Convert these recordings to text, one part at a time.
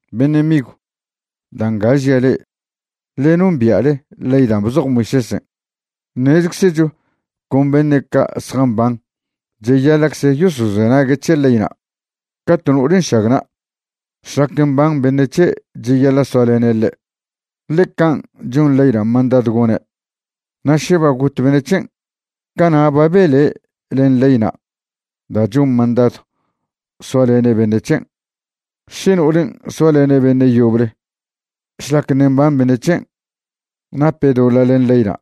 Beṉe' migw, da' nga žia' le'e, ḻe nombia'le ley dan' bzoj Moisésen'. Ṉezczecho con beṉe' ca' zjamban cheyaḻa'cze yosozenague' c̱he leyna'. Ca to no'ole nšagna', šlac mban beṉe' c̱he' cheyaḻa' soalene' ḻe', ḻe can' chon leyna' mandadw gone'. Na' še ba got beṉe' c̱hen', cana' ba bele' len leyna' da' chon mandadw soalene' beṉe' c̱hen'. Še no'olen' soalene' beṉe' yoble šlac ṉe' mban beṉe' c̱hen', nape' doḻa' len leyna'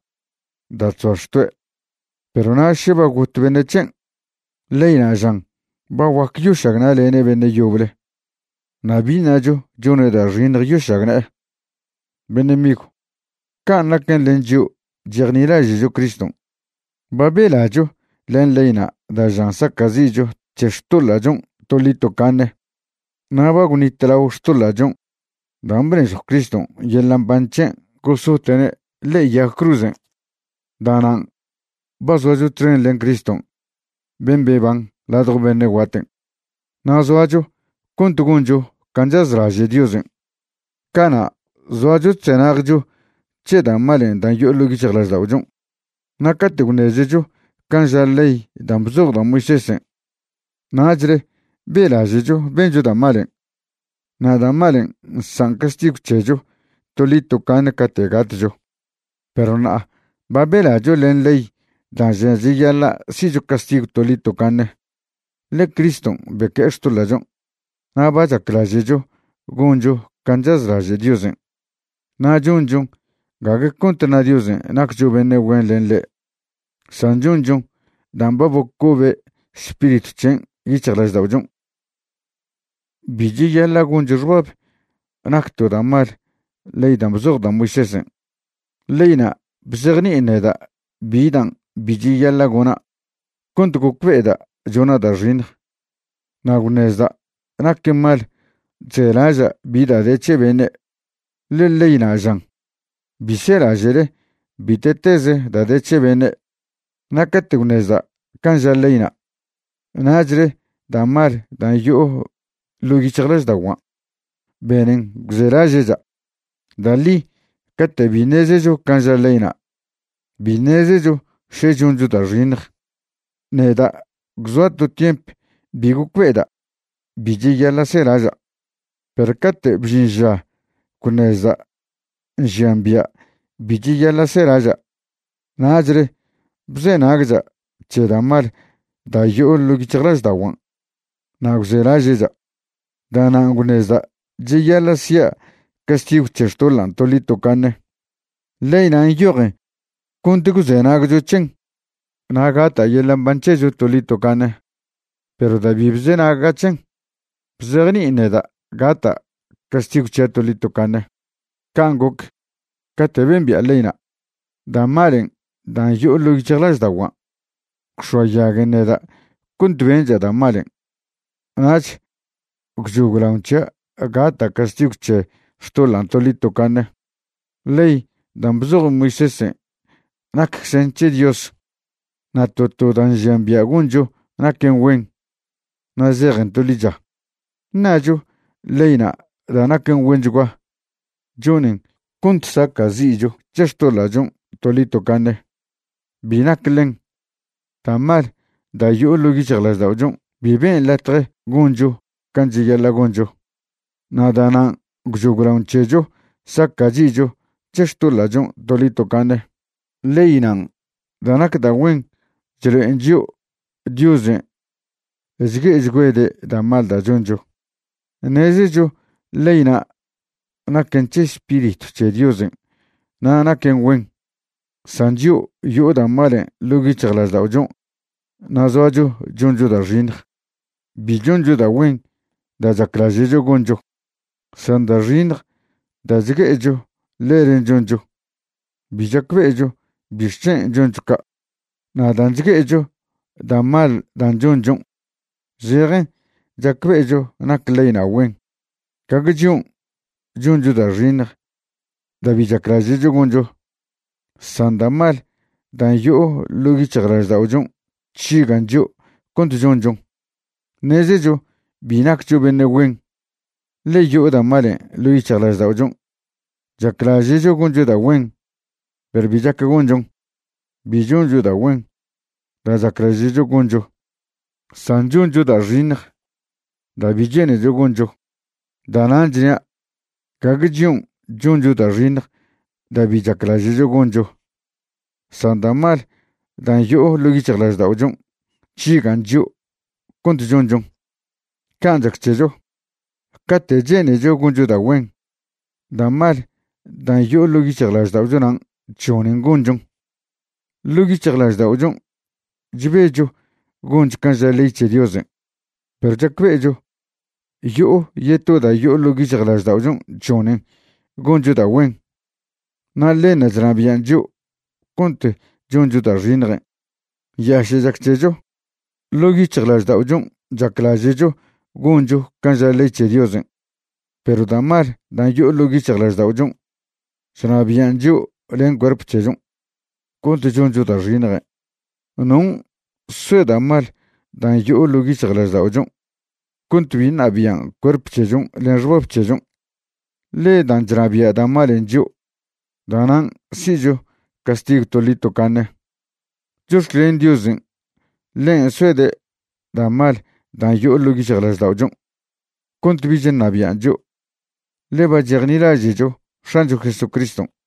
da' chzoa xtoe'. Perw na' še ba got beṉe' c̱hen', leyna' žan ba guac yošagna'lene' beṉe' yoble na' bi ṉacho chone' da' xiṉj yošagne'e. Beṉe' migw, can' naquen len chio' chejnilaže'cho Criston'. Ba belacho len leyna' da' žan saca'zi'cho c̱he xtoḻa'chon' toḻi tocaṉe. Na' ba gwnitlao xtoḻa'chon' dan' bnežjw Criston' yeḻa' mban c̱hen' gosote'ne' ḻe'e yag cruzen'. Da'nan' ba zoacho txen len Criston' ben' beban ladjo beṉe' guaten', na' zoacho cont goncho can' chazlaže' Diosen'. Cana' zoacho chzenagcho c̱he da' malen' dan' yo'o ḻo' yic̱hjlažda'ochon'. Na' cate' gwṉezecho can' ža ley dan' bzoj da' Moisésen', nachle be'laže'cho bencho da' malen', na' da' malen' nsan' castigw c̱hecho toḻi tocaṉe cate' gatcho. Perw ṉa'a ba belacho len ley da' žan cheyaḻa' si'cho castigw toḻi tocaṉe, ḻe Criston' beque'e xtoḻa'chon'. Na' ba chaclaže'cho goncho can' chazlaže' Diosen', na' chonchon gague cont ṉa Diosen' naccho beṉe' güen len ḻen', san chonchon dan' ba bocobe Spiritw c̱hen' yic̱hjlažda'ochon'. Bi cheyaḻa' goncho xbab nac to da' mal ley dan' bzoj da' Moisésen'. Leyna' bzejni'in neda' bi dan' bi cheyaḻa' gona' cont gocbe'eda' chona' da' xiṉj. Na' gwṉezda' naquen mal chzelaža' bi da' de c̱he beṉe', ḻe leyna' žan: “Bi selaže'le bite'teze da' de c̱he beṉe'.” Na' cate' gwṉezda' can' ža leyna', nachle da' mal dan' yo'o ḻo' yic̱hjlažda'oguan' benen gwzelaže'cha'. Da' ḻi cate' bi ṉezecho can' ža leyna', bi ṉezecho še choncho da' xiṉj. Neda' gwzoa' to tiemp bi gocbe'eda' bi cheyaḻa' selaža'. Perw cate' bžin ža gwṉezda' nžian bia' bi cheyaḻa' selaža', nachle bzenagcha' c̱he da' mal da' yo'o ḻo' yic̱hjlažda'oguan' na' gwzelaže'cha'. Da'nan' gwṉezda' cheyaḻa' sia' castigw c̱he xtoḻan' toḻi tocaṉe. Leyna' nyojen cont gwzenagcho c̱hen na' gata' yeḻa' mban c̱hecho toḻi tocaṉe, perw da' bi bzenaga' c̱hen, bzejni'in neda' gata' castigw c̱hia' toḻi tocaṉe. Can' goc, cate' bembi'a leyna', da' malen' da' yo'o ḻo' yic̱hjlažda'oguan' gwx̱oayaguen neda' cont bencha' da' malen', nach gwchoglaon c̱hia' gata' castigw c̱he xtoḻan' toḻi tocaṉe. Ley dan' bzoj Moisésen' nacczen c̱he Dios, na' to to da' nžian bia' goncho naquen güen na' zejen to ḻicha. ¿Ṉacho leyna' da' naquen güenchguan' chonen cont saca'zi'cho c̱he xtoḻa'chon' toḻi tocaṉe? Bi nac ḻen. Da' mal da' yo'o ḻo' yic̱hjlažda'ochon' bi ben' latje goncho can' cheyaḻa' goncho, na' da'nan' gwchoglaon c̱hecho saca'zi'cho c̱he xtoḻa'chon' toḻi tocaṉe. Leynan' da' nac da' güen chlo'en chio' Diosen' chgue'echgüede' da' mal da' choncho. Ṉezecho leyna' naquen c̱he Spiritw c̱he Diosen' na' naquen güen, san chio' yo'o da' malen' ḻo' yic̱hjlažda'ochon' na' zoacho choncho da' xiṉj. Bi choncho da' güen da' chaclaže'cho goncho, san da' xiṉj da' chgue'echo ḻelen' choncho. Bi chacbe'echo bixc̱hen' choncho ca'. Na' dan' chgue'echo da' mal dan' chonchon', zejen chacbe'echo nac leyna' güen. Gague chion' choncho da' xiṉj da' bi chaclaže'cho goncho, san da' mal dan' yo'o ḻo' yic̱hjlažda'ochon' chžigan' chio' cont chonchon. Ṉezecho bi naccho beṉe' güen, ḻe yo'o da' malen' ḻo' yic̱hjlažda'ochon'. Chaclaže'cho goncho da' güen perw bi chac gonchon. Bi choncho da' güen da' chaclaže'cho goncho, san choncho da' xiṉj da' bi che'necho goncho. Da'nan' chnia', gague chion' choncho da' xiṉj da' bi chaclaže'cho goncho, san da' mal dan' yo'o ḻo' yic̱hjlažda'ochon' chžigan' chio' cont chonchon. Can' chac c̱hecho, cate' che'necho goncho da' güen, da' mal dan' yo'o ḻo' yic̱hjlažda'ochonan' chžonen gonchon. Ḻo' yic̱hjlažda'ochon' chbecho goncho can' ža ley c̱he Diosen', perw chacbe'echo, yo'o yeto da' yo'o ḻo' yic̱hjlažda'ochon' chžonen goncho da' güen, na' ḻenṉa' chnabian' chio' cont choncho da' xiṉjen'. ¡Nyaše' chac c̱hecho! Ḻo' yic̱hjlažda'ochon' chaclaže'cho goncho can' ža ley c̱he Diosen', perw da' mal dan' yo'o ḻo' yic̱hjlažda'ochon' chnabian' chio' len cuerp c̱hechon' cont choncho da' xiṉjen'. ¿Non' soe da' mal dan' yo'o ḻo' yic̱hjlažda'ochon' cont bi ṉabian' cuerp c̱hechon' len xbab c̱hechon'? Ḻe dan' chnabia' da' malen' chio' da'nan' si'cho castigw toḻi tocaṉe. Chox̱clen Diosen' ḻen' soede' da' mal dan' yo'o ḻo' yic̱hjlažda'ochon' cont bich ṉabian' chio', ḻe ba chejnilaže'cho X̱ancho Jesucriston'.